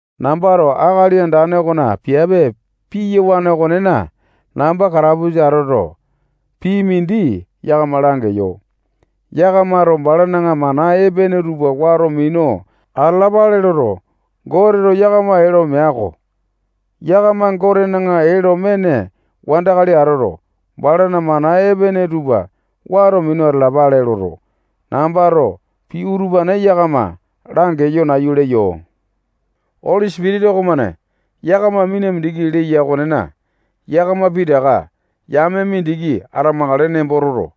Nambato Akali Andane okona piape piyawane okonena, namba katapusa atoto, pii mindi yakama langeyo. Yakamato balana mana epene tupa wato minu atalapale loto, Goteto yakama ee lo mea-ko. Yakama Gotena ee lo mene wandakali atoto, balana mana epene tupa wato minu atalapale loto, nambato pii utupane yakama langeyo nayu leyo. Oli Sipitisa okomane yakama mina mindiki leya okonena, yakama pitaka yame mindiki atamakale nembo toto,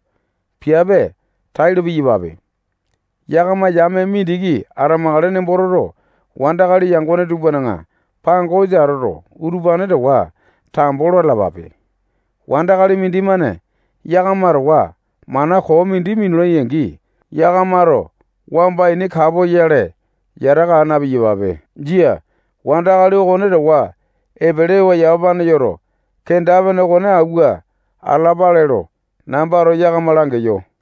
piape tailo piyapape. Yakama yame mindiki atamakale nembo toto, wandakali yangone tupana pangosa atoto, utupane towa tambo lo atalapape. Wandakali mindimane yakama towa mana koo mindi minulai-angi, yakamato wamba ini kapoyale yataka aa na-piyapape. Jia. Wandakali okone towa epelewa yamapane yoto, kenda-pene okone awua atalapape lo nambato yakama langeyo.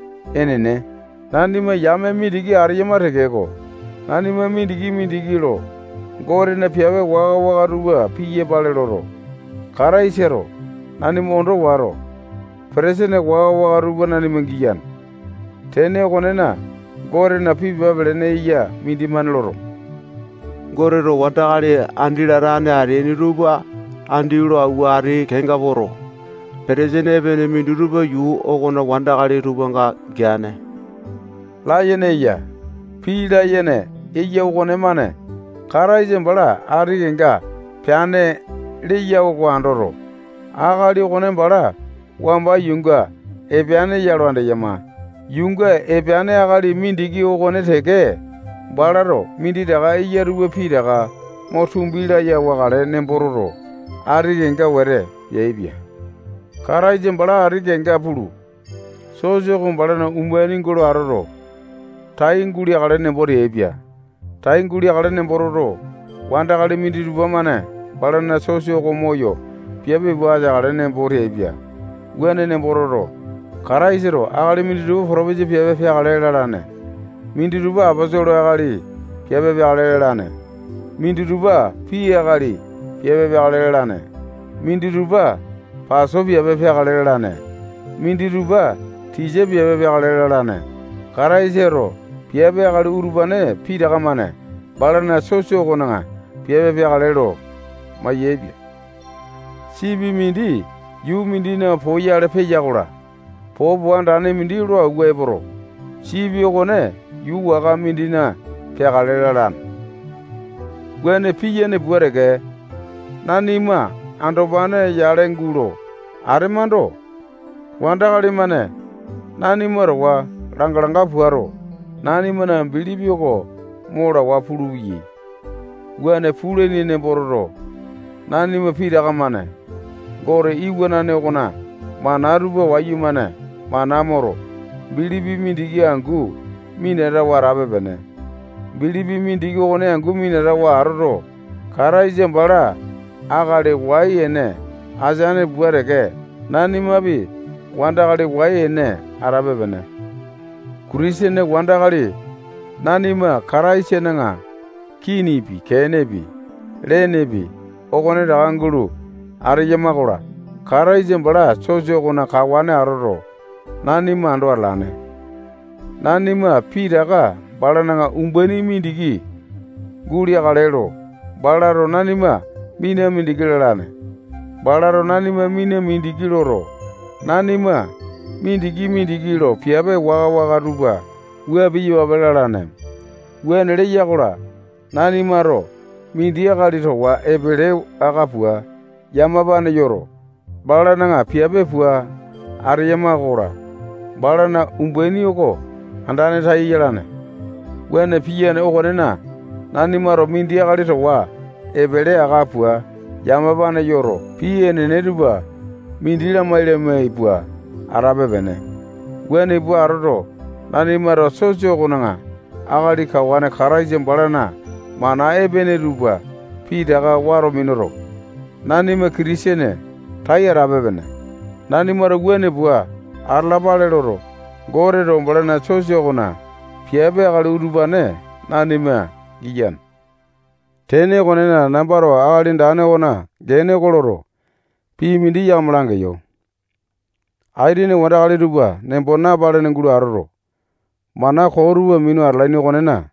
Enene, nanima yame mindiki ateyama tekeko, nanima mindiki-mindiki lo Gotena piape waka-waka tupa piyapale loto, Kataisato nanima ondo wato, petesene waka-waka tupa nanima giyane. Tene okonena, Gotena pii pepa pelene eya mindimane loto, Goteto wandakali andi latane ateaini tupa andi lo awua ati kenga poto, petesene epene minditupa yuu okona wandakali tupanga geane layene eya. Pii layene okonemane Kataisa bala ati kenga peane leya oko andoto, akali okone bala wamba yuunga epeane ya lo andeyama. Yuunga epeane akali mindiki okone teke balato minditaka eya tupa pitaka mo tumbi laya wakale nembo toto, ati kenga wete peaipia. Kataisa bala ati kenga pulu, sosa oko balana umbaini gulo atoto, tai guleakale nembo teaipia. Tai guleakale nembo toto, wandakali minditupa-mane balana sosa oko moyo piape pua ateakale nembo teaipia. Wuane nembo toto, Kataisato akali minditupa potopesa piape peakale lalane. Minditupa aposolo akali piape peakale lalane. Minditupa pii akali piape peakale lalane. Minditupa paso piape peakale lalane. Minditupa tisa piape peakale lalane. Kataisato piape akali utupane pitaka-mane balana sosa okona piape peakale lo mayaepia. Sipi mindi yuu mindina poyale peya-kola, popo andane mindi lo awua epoto, sipi okone yuu waka mindina peakale lalane. Wuane piyane pua teke, nanima andopane yale gulo atemando, wandakali-mane nanima towa langa-langa puato, nanimana bilipi oko mo lawa pulupeyai. Wuane pulaini nembo toto, nanima pitaka-mane Gote iwanane okona mana tupa wayumane mana moto, bilipi mindiki angu minatawa atape-pene. Bilipi mindiki okone angu minatawa atoto, Kataisa bala akali wai ene ateane pua teke, nanimapi wandakali wai ene atape-pene. Kitisene wandakali nanima Kataisana kinipi, kenepi, lenepi, okonetaka gulo ateyama-kola, Kataisa bala sosa okona kawane atoto, nanima ando atalane. Nanima pitaka balana umbaini mindiki guleakale lo, balato nanima mina mindiki lalane. Balato nanima mina mindiki loto, nanima mindiki-mindiki lo piape waka-waka tupa wua piyapape lalane. Wuane leya-kola, nanimato mindi akali towa epele aka pua yamapane yoto, balana piape pua ateyama-kola, balana umbaini oko andane tai yalane. Wuane piyane okonena, nanimato mindi akali towa epele aka pua yamapane yoto, pii enene tupa mindi lamai-lamai pua atape-pene. Wuane pua atoto, nanimato sosa okona akali kawane Kataisa balana mana epene tupa pitaka wato minuto, nanima Kitisene tai atape-pene. Nanimato wuane pua atalapale loto, Goteto balana sosa okona piape akali utupane nanima giyane. Tene okonena, nambato Akali Andane okona gene oko loto, pii mindi yakama langeyo. Aitene wandakali tupa nembo napalene gulo atoto, mana koo tupa minu atalaini okonena,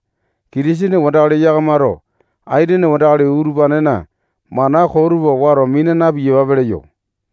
Kitisene wandakali yakamato aitene wandakali utupanena mana koo utupa wato mina na-piyapape leyo.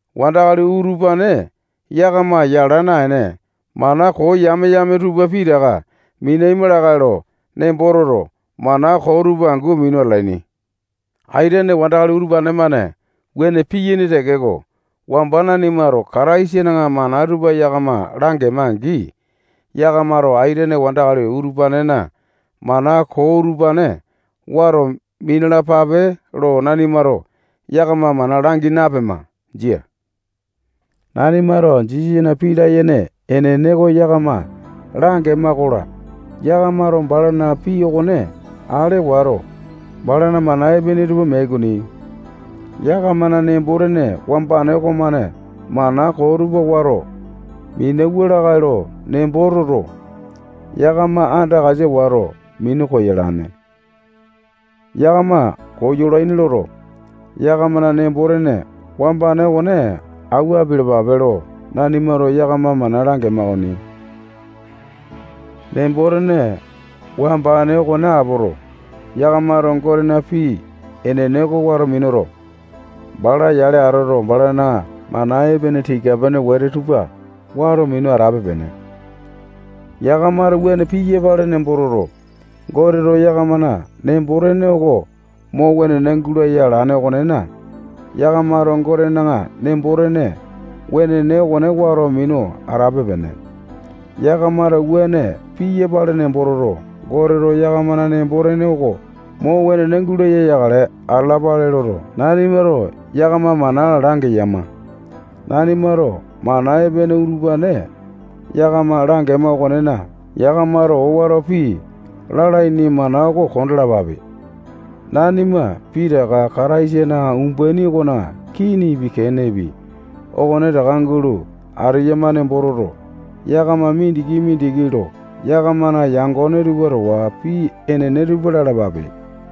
Wandakali utupane yakama yala naene, mana koo yame-yame tupa pitaka minaima lakae lo nembo toto, mana koo tupa angu minu atalaini. Aitene wandakali utupane-mane wuane piyaini tekeko, wamba nanimato Kataisana mana tupa yakama langema-angi, yakamato aitene wandakali utupanena mana koo utupane wato minalapape lo nanimato yakama mana langi napema. Jia. Nanimato Jisasana pii layene enene oko yakama langema-kola, yakamato balana pii okone ale wato, balana mana epene tupa meai okoni. Yakamana nembo-tene wambane okomane mana koo tupa wato minauwa lakae lo nembo toto, yakama andakasa wato, minu koyolane. Yakama koyolaini loto, yakamana nembo-tene wambane okone awua apialapape lo nanimato yakama mana langema okoni. Nembo-tene wambane okone apoto, yakamato Gotena pii enene oko wato minuto, bala yale atoto, balana mana epene tika-pene wete tupa wato minu atape-pene. Yakamato wuane piyapale nembo toto, Goteto yakamana nembo-tene oko mo wenene gulaya alane okonena, yakamato Gotena nembo-tene wenene okone wato minu atape-pene. Yakamato wuane piyapale nembo toto, Goteto yakamana nembo-tene oko mo wenene gulaya yakale atalapale loto, nanimato yakama mana langeyama. Nanimato mana epene utupane yakama langema okonena, yakamato owato pii lalaini mana oko kondalapape. Nanima pitaka Kataisana umbaini okona kinipi, kenepi, okonetaka gulo ateyama nembo toto, yakama mindiki-mindiki lo yakamana yangone tupa towa pii enene tupa lalapape.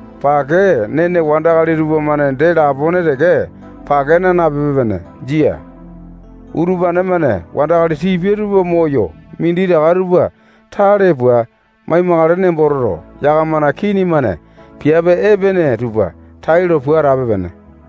Pake nene wandakali tupamane dee lapone pake naa nape-pene. Jia. Utupane-mane wandakali tipia tupa moyo minditaka tupa tale pua mai-makale nembo toto, yakamana kini-mane piape epene tupa tailo pua atape-pene.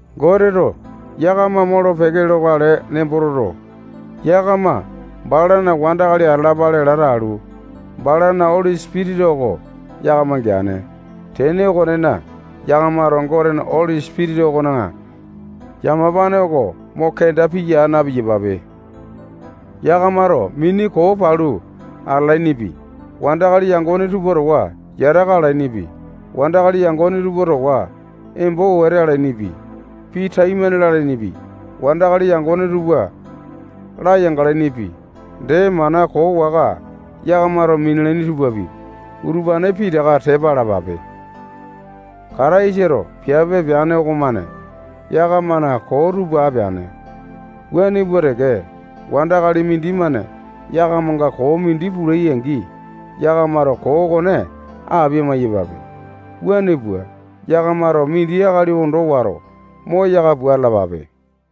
Goteto yakama molo-peke lokale nembo toto, yakama balana wandakali atalapale lata alu, balana Oli Sipitisa oko yakama geane. Tene okonena, yakamato Gotena Oli Sipitisa okona yamapane oko mo kenda piya aa na-piyapape. Yakamato mini koo palu atalainipi, wandakali yangone tupa towa yataka alainipi, wandakali yangone tupa towa embo wete alainipi, pii taimane lalainipi, wandakali yangone tupa layanga alainipi, dee mana koo waka yakamato minalaini tupapi, utupane pitaka tepa alapape. Kataisato piape peane okomane yakamana koo tupa apeane. Wuane pua teke, wandakali mindimane yakamanga koo mindi pulai-angi, yakamato koo okone apia-maiyapape. Wuane pua, yakamato mindi akali ondo wato, moyaka pua atalapape.